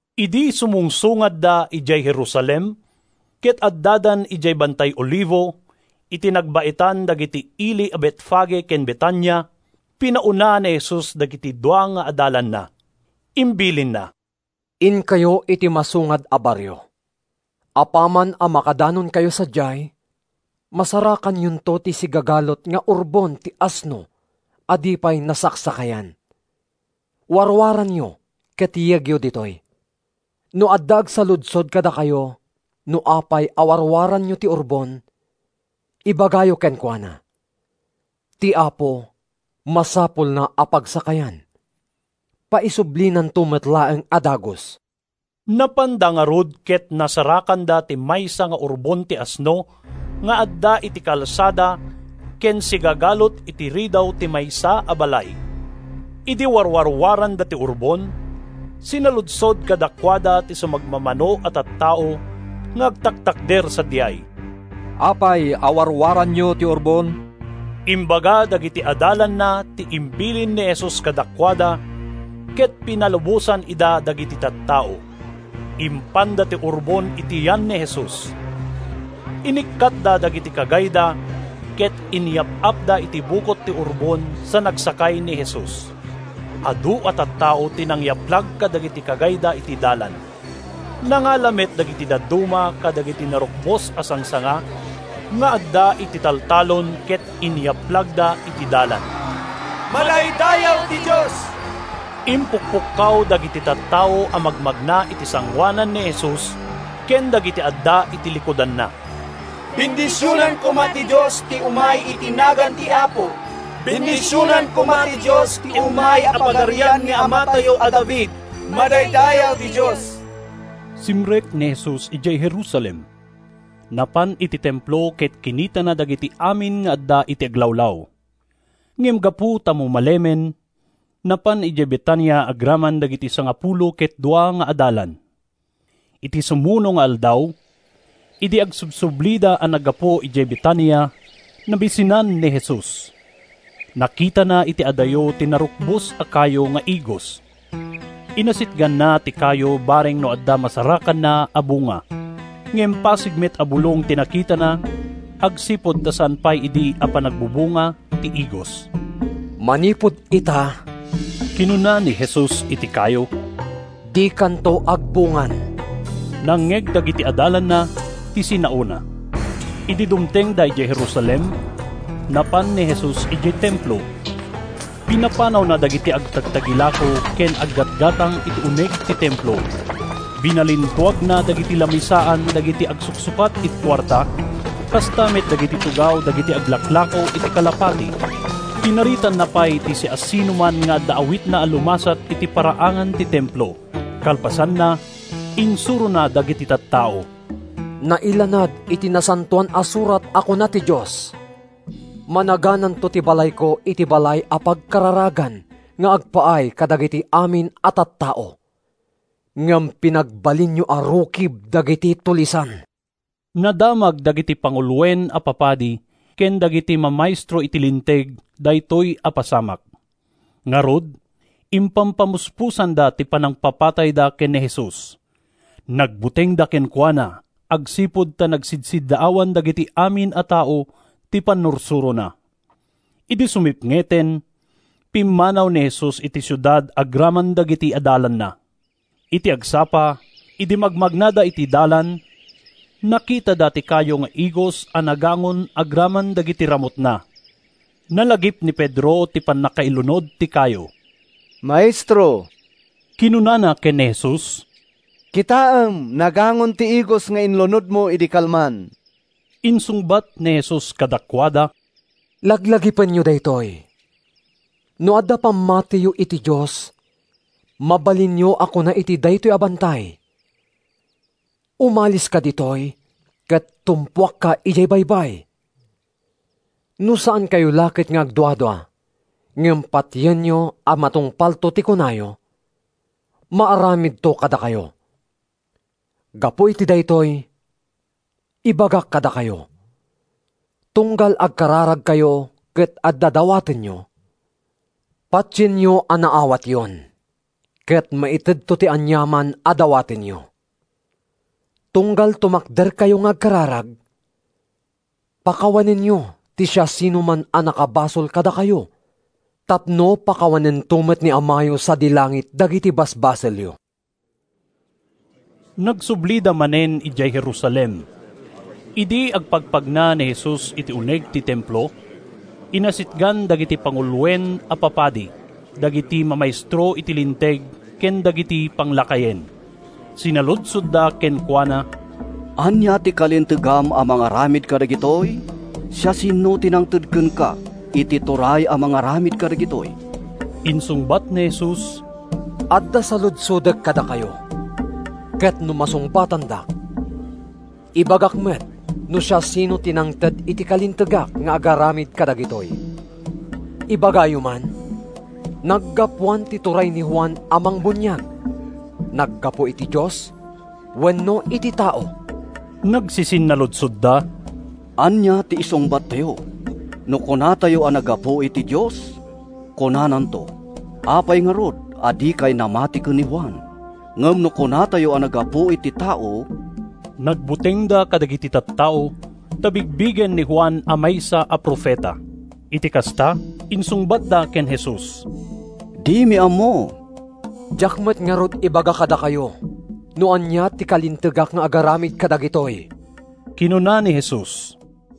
Idi sumungsungadda idiay Jerusalem, ket addadan idiay Bantay Olivo, iti nagbaetan dagiti ili a Betfage ken Betania, pinauna ni Jesus dagiti dua nga adalanna. Imbilinna, “Inkayo iti masungad a barrio. Apaman a makadanonkayo sadiay, masarakanyonto ti sigagalut nga urbon ti asno a di pay nasaksakayan. Warwaranyo ket yegyo ditoy. No adda agsaludsod kadakayo no apay a warwaranyo ti urbon, ibagayo kenkuana, ‘Ti Apo masapulna a pagsakayan; paisublinanto met laeng a dagus.’” Napanda ngarud ket nasarakanda ti maysa nga urbon ti asno nga adda iti kalsada ken sigagalut iti ridaw ti maysa a balay. Idi warwarwaranda ti urbon, sinaludsod kadakuada ti sumagmamano a tattao nga agtaktakder sadiay, “Apay a warwaranyo ti urbon?” Imbaga dagiti adalanna ti imbilin ni Jesus kadakuada ket pinalubosan ida dagiti tattao. Impanda ti urbon iti yan ni Jesus. Inikkatda dagiti kagayda ket inyap-apda iti bukot ti urbon sa nagsakay ni Jesus. Adu a tattao ti nangyaplag kadagiti kagayda iti dalan. Nangala met dagiti dadduma kadagiti narukbos a sangsanga nga adda iti taltalon ket inyaplagda iti dalan. “Madaydayaw ti Dios!” impukpukkaw dagiti tattao a magmagna iti sangoanan ni Jesus, ken dagiti adda iti likudanna. “Bendisionan koma ti Dios ti umay iti nagan ti Apo! Bendisionan koma ti Dios ti umay a pagarian ni amatayo a David! Madaydayaw ti Dios!” Simrek ni Jesus idiay Jerusalem. Napan iti Templo ket kinitana dagiti amin nga adda iti aglawlaw. Ngem gapu ta mumalemen, napan idiay Betania agraman dagiti sangapulo ket dua nga adalan. Iti sumuno nga aldaw, idi agsubsublida a naggapu idiay Betania, nabisinan ni Jesus. Nakitana iti adayo ti narukbos a kayo nga igos. Inasitganna ti kayo bareng no adda masarakanna a bunga. Ngem pasig met a bulong ti nakitana agsipud ta saan pay idi a panagbubunga ti igos. “Manipud ita,” kinuna ni Jesus iti kayo, “dikanto agbungan!” Nangngeg dagiti adalanna ti sinaona. Idi dumtengda idiay Jerusalem, napan ni Jesus idiay Templo. Pinapanawna dagiti agtagtagilako ken aggatgatang iti uneg ti Templo. Binalintuagna dagiti lamisaan dagiti agsuksukat iti kuarta, kasta met dagiti tugaw dagiti aglaklako iti kalapati. Pinaritanna pay ti siasinoman nga adda awitna a lumasat iti paraangan ti Templo. Kalpasanna, insurona dagiti tattao, “Nailanad iti Nasantoan a Surat a kuna ti Dios, ‘Managananto ti balayko iti balay a pagkararagan nga agpaay kadagiti amin a tattao.’ Ngem pinagbalinyo a rukib dagiti tulisan!” Nadamag dagiti panguloen a papadi ken dagiti mamaestro iti Linteg daytoy a pasamak. Ngarud, impampamuspusanda ti panangpapatayda ken ni Jesus. Nagbutengda kenkuana agsipud ta nagsidsiddaawan dagiti amin a tao ti pannursurona. Idi sumipngeten, pimmanaw ni Jesus iti siudad agraman dagiti adalanna. Iti agsapa, idi magmagnada iti dalan, nakitada ti kayo nga igos a nagangon agraman dagiti ramutna. Nalagip ni Pedro ti pannakailunod ti kayo. “Maestro,” kinunana ken ni Jesus, “kitaem! Nagangon ti igos nga inlunodmo idi kalman!” Insungbat ni Jesus kadakuada, “Laglagipenyo daytoy! No adda pammatiyo iti Dios, mabalinyo a kuna iti daytoy a bantay, ‘Umaliska ditoy ket tumpuakka idiay baybay.’ No saankayo la ket nga agduadua, ngem patienyo a matungpalto ti kunayo, maaramidto kadakayo. Gapu iti daytoy, ibagak kadakayo: Tunggal agkararagkayo ket adda dawatenyo, patienyo a naawatyon, ket maitedto ti aniaman a dawatenyo. Tunggal tumakderkayo nga agkararag, pakawanenyo ti siasinoman a nakabasol kadakayo tapno pakawanento met ni Amayo sadi langit dagiti basbasolyo.” Nagsublida manen idiay Jerusalem. Idi agpagnapagna ni Jesus iti uneg ti Templo, inasitgan dagiti panguloen a papadi, dagiti mamaestro iti Linteg ken dagiti panglakayen. Sinaludsodda kenkuana, “Ania ti kalintegam a mangaramid kadagitoy? Siasino ti nangted kenka iti turay a mangaramid kadagitoy?” Insungbat ni Jesus, “Adda saludsodek kadakayo, ket no masungbatandak, ibagak met no siasino ti nangted iti kalintegak nga agaramid kadagitoy. Ibagayo man, naggapuan ti turay ni Juan a mangbuniag: naggapu iti Dios wenno iti tao?” Nagsisinnaludsodda, “Ania ti isungbattayo? No kunatayo a naggapu iti Dios, kunananto, ‘Apay ngarud a dikay namati ken ni Juan?’ Ngem no kunatayo a naggapu iti tao…” (Nagbutengda kadagiti tattao, ta bigbigenda ni Juan a maysa a profeta.) Iti kasta, insungbatda ken Jesus, “Dimi ammo.” “Diak met ngarud ibaga kadakayo no ania ti kalintegak nga agaramid kadagitoy,” kinuna ni Jesus.